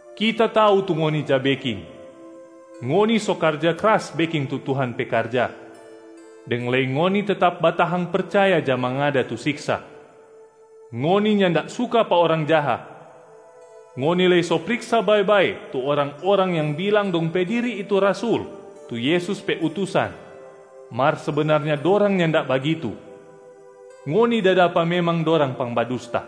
Kita tau tu ngoni ja beking. Ngoni so karja kras beking tu Tuhan pe karja, deng lei ngoni tetap batahang percaya ja mangada tu siksa. Ngoni nyanda suka pa orang jaha. Ngoni lei so priksa bae-bae tu orang-orang yang bilang dong pe diri itu rasul tu Yesus pe utusan, mar sebenarnya dorang nyanda bagitu, ngoni da dapa memang dorang pangbadusta.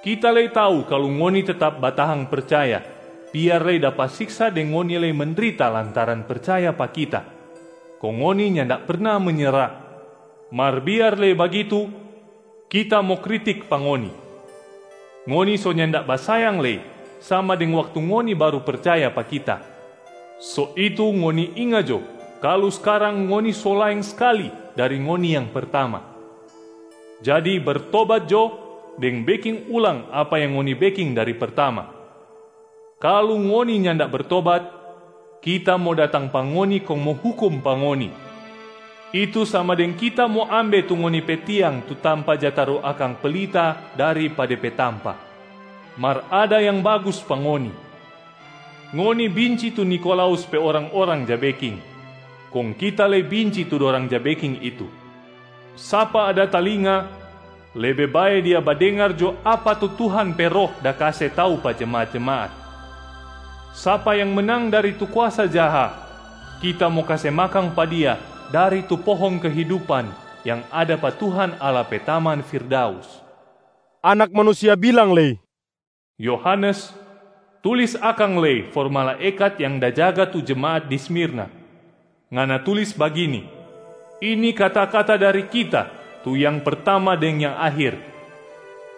Kita lei tau kalu ngoni tetap batahang percaya biar lei dapa siksa deng ngoni lei mendrita lantaran percaya pa Kita, kong ngoni nyanda perna menyera. Mar biar lei bagitu, Kita mo kritik pa ngoni: ngoni so nyanda basayang lei sama deng waktu ngoni baru percaya pa Kita. So itu ngoni inga jo kalu skarang ngoni so laeng skali dari ngoni yang pertama. Jadi bertobat jo deng beking ulang apa yang ngoni beking dari pertama. Kalu ngoni nyanda bertobat, Kita mo datang pa ngoni kong mo hukum pa ngoni, itu sama deng Kita mo ambe tu ngoni pe tiang tu tampa ja taru akang pelita dari pa de pe tampa. Mar ada yang bagus pa ngoni, ngoni binci tu Nikolaus pe orang-orang ja beking, kong Kita lei binci tu dorang ja beking itu. Sapa ada talinga, lebe bae dia badengar jo apa tu Tuhan pe Roh da kase tau pa jemaat-jemaat, ‘Sapa yang menang dari tu kuasa jaha, Kita mo kase makang pa dia dari tu pohong kehidupan yang ada pa Tuhan Allah pe taman firdaus.’” Anak Manusia bilang lei, “Yohanes, tulis akang lei for malaekat yang da jaga tu jemaat di Smirna. Ngana tulis bagini: Ini kata-kata dari Kita tu Yang Pertama deng Yang Akhir.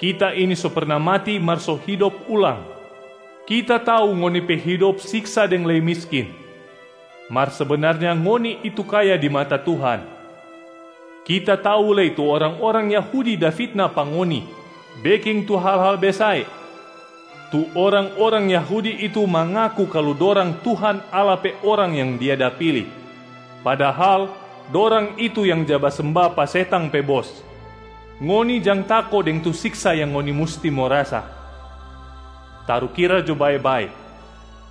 Kita ini so perna mati mar so hidop ulang. Kita tau ngoni pe hidop siksa deng lei miskin, mar sebenarnya ngoni itu kaya di mata Tuhan. Kita tau lei tu orang-orang Yahudi da fitna pa ngoni beking tu hal-hal besae. Tu orang-orang Yahudi itu mangaku kalu dorang Tuhan Allah pe orang yang Dia da pili, padahal dorang itu yang ja basemba pa setang pe bos. Ngoni jang tako deng tu siksa yang ngoni musti mo rasa. Tarukira jo bae-bae,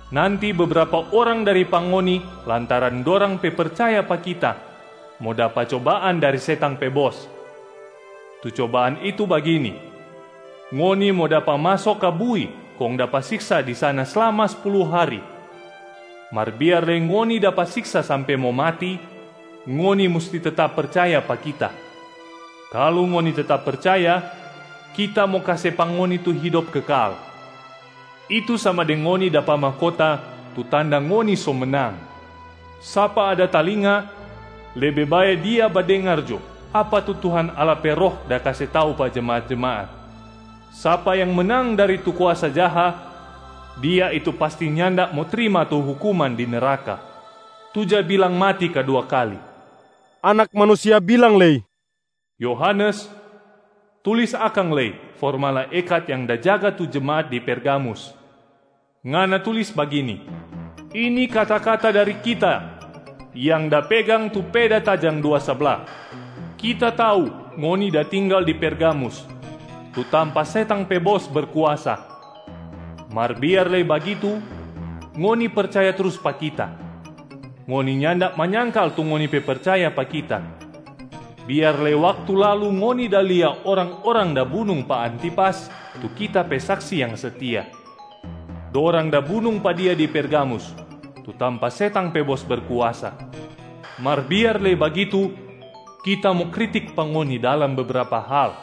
nanti bebrapa orang dari pa ngoni lantaran dorang pe percaya pa Kita mo dapa cobaan dari setang pe bos. Tu cobaan itu bagini, ngoni mo dapa maso ka bui kong dapa siksa di sana slama spulu hari. Mar biar lei ngoni dapa siksa sampe mo mati, ngoni musti tetap percaya pa Kita. Kalu ngoni tetap percaya, Kita mo kase pa ngoni tu hidop kekal, itu sama deng ngoni dapa mahkota tu tanda ngoni so menang. Sapa ada talinga, lebe bae dia badengar jo apa tu Tuhan Allah pe Roh da kase tau pa jemaat-jemaat, ‘Sapa yang menang dari tu kuasa jaha, dia itu pasti nyanda mo trima tu hukuman di neraka, tu ja bilang mati kadua kali.’” Anak Manusia bilang lei, “Yohanes, tulis akang lei for malaekat yang da jaga tu jemaat di Pergamus. Ngana tulis bagini: Ini kata-kata dari Kita yang da pegang tu peda tajang dua sabla. Kita tau ngoni da tinggal di Pergamus, tu tampa setang pe bos berkuasa. Mar biar lei bagitu, ngoni percaya trus pa Kita, ngoni nyanda manyangkal tu ngoni pe percaya pa Kita, biar lei waktu lalu ngoni da lia orang-orang da bunung pa Antipas tu Kita pe saksi yang setia. Dorang da bunung pa dia di Pergamus, tu tampa setang pe bos berkuasa. Mar biar lei bagitu, Kita mo kritik pa ngoni dalam bebrapa hal: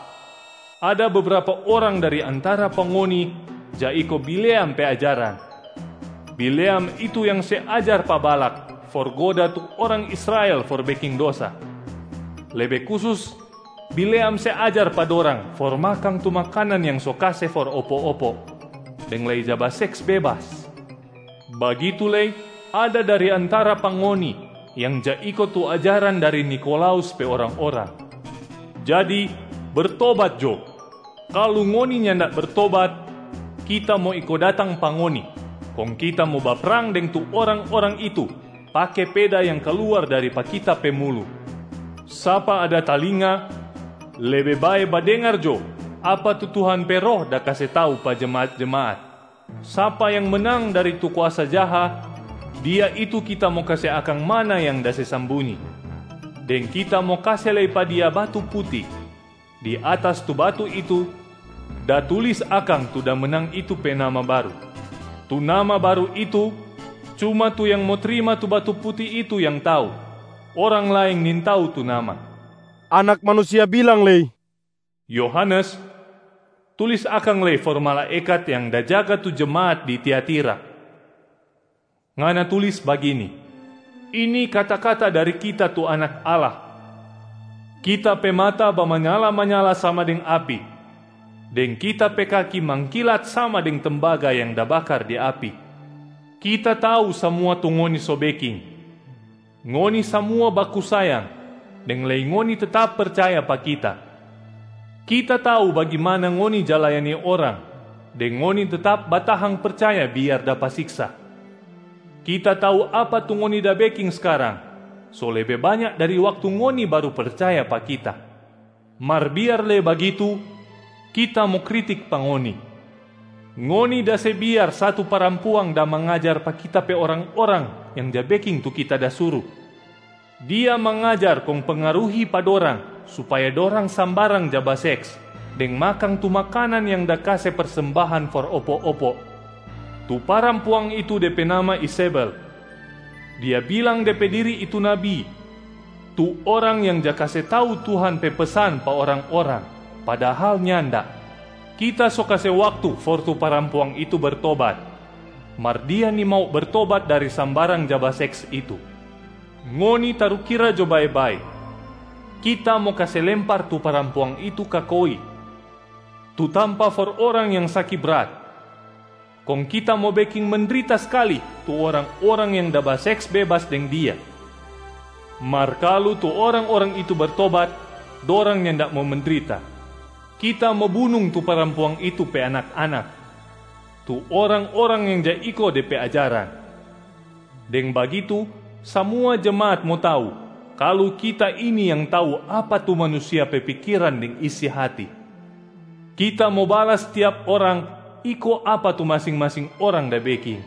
ada bebrapa orang dari antara pa ngoni ja iko Bileam pe ajaran. Bileam itu yang se ajar pa Balak for goda tu orang Israel for beking dosa. Lebe kusus Bileam se ajar pa dorang for makang tu makanan yang so kase for opo-opo, deng lei ja baseks bebas. Bagitu lei ada dari antara pa ngoni yang ja iko tu ajaran dari Nikolaus pe orang-orang. Jadi bertobat jo. Kalu ngoni nyanda bertobat, Kita mo iko datang pa ngoni kong Kita mo baprang deng tu orang-orang itu pake peda yang kaluar dari pa Kita pe mulu. Sapa ada talinga, lebe bae badengar jo apa tu Tuhan pe Roh da kase tau pa jemaat-jemaat, ‘Sapa yang menang dari tu kuasa jaha, dia itu Kita mo kase akang manna yang da se sambunyi,a deng Kita mo kase lei pa dia batu puti. Di atas tu batu itu da tulis akang tu da menang itu pe nama baru. Tu nama baru itu cuma tu yang mo trima tu batu puti itu yang tau, orang laeng nintau tu nama.’” Anak Manusia bilang lei, “Yohanes, tulis akang lei for malaekat yang da jaga tu jemaat di Tiatira. Ngana tulis bagini: Ini kata-kata dari Kita tu Anak Allah. Kita pe mata bamanyala-manyala sama deng api, deng Kita pe kaki mangkilat sama deng tembaga yang da bakar di api. Kita tau samua tu ngoni so beking. Ngoni samua baku sayang, deng lei ngoni tetap percaya pa Kita. Kita tau bagimana ngoni ja layani orang deng ngoni tetap batahang percaya biar dapa siksa. Kita tau apa tu ngoni da beking skarang so lebe banya dari waktu ngoni baru percaya pa Kita. Mar biar lei bagitu, Kita mo kritik pa ngoni: ngoni da se biar satu parampuang da mangajar pa Kita pe orang-orang yang ja beking tu Kita da suru. Dia mangajar kong pengaruhi pa dorang supaya dorang sambarang ja baseks deng makang tu makanan yang da kase persembahan for opo-opo. Tu parampuang itu de pe nama Izebel. Dia bilang de pe diri itu nabi tu orang yang ja kase tau Tuhan pe pesan pa orang-orang padahal nyanda. Kita so kase waktu for tu parampuang itu bertobat, mar dia nimau bertobat dari sambarang ja baseks itu. Ngoni tarukira jo bae-bae, Kita mo kase lempar tu parampuang itu ka koi, tu tampa for orang yang saki brat. Kong Kita mo beking mendrita skali tu orang-orang yang da baseks bebas deng dia. Mar kalu tu orang-orang itu bertobat, dorang nyanda mo mendrita. Kita mo bunung tu parampuang itu pe anak-anak, tu orang-orang yang ja iko de pe ajaran. Deng bagitu samua jemaat mo tau kalu Kita ini yang tau apa tu manusia pe pikiran deng isi hati. Kita mo balas tiap orang iko apa tu masing-masing orang da beking.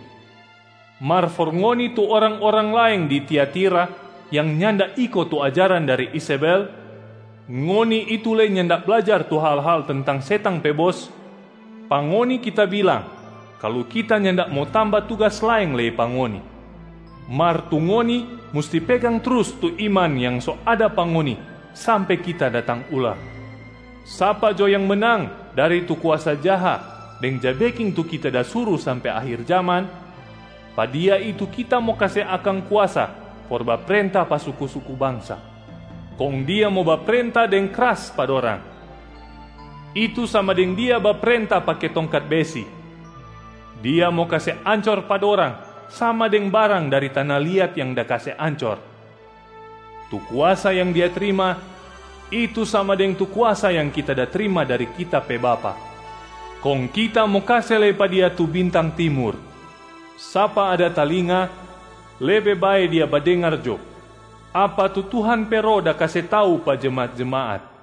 Mar for ngoni tu orang-orang laeng di Tiatira yang nyanda iko tu ajaran dari Izebel, ngoni itu lei nyanda blajar tu hal-hal tentang setang pe bos, pa ngoni Kita bilang kalu kita nyanda mo tamba tugas laeng lei pa ngoni. Mar tu ngoni musti pegang trus tu iman yang so ada pa ngoni sampe Kita datang ulang. Sapa jo yang menang dari tu kuasa jaha deng ja beking tu Kita da suru sampe akhir jaman, pa dia itu Kita mo kase akang kuasa for baprenta pa suku-suku bangsa. Kong dia mo baprenta deng kras pa dorang, itu sama deng dia baprenta pake tongkat besi. Dia mo kase ancor pa dorang sama deng barang dari tana liat yang da kase ancor. Tu kuasa yang dia trima, itu sama deng tu kuasa yang Kita da trima dari Kita pe Bapa. Kong Kita mo kase lei pa dia tu bintang timur. Sapa ada talinga, lebe bae dia badengar jo apa tu Tuhan pe Roh da kase tau pa jemaat-jemaat.”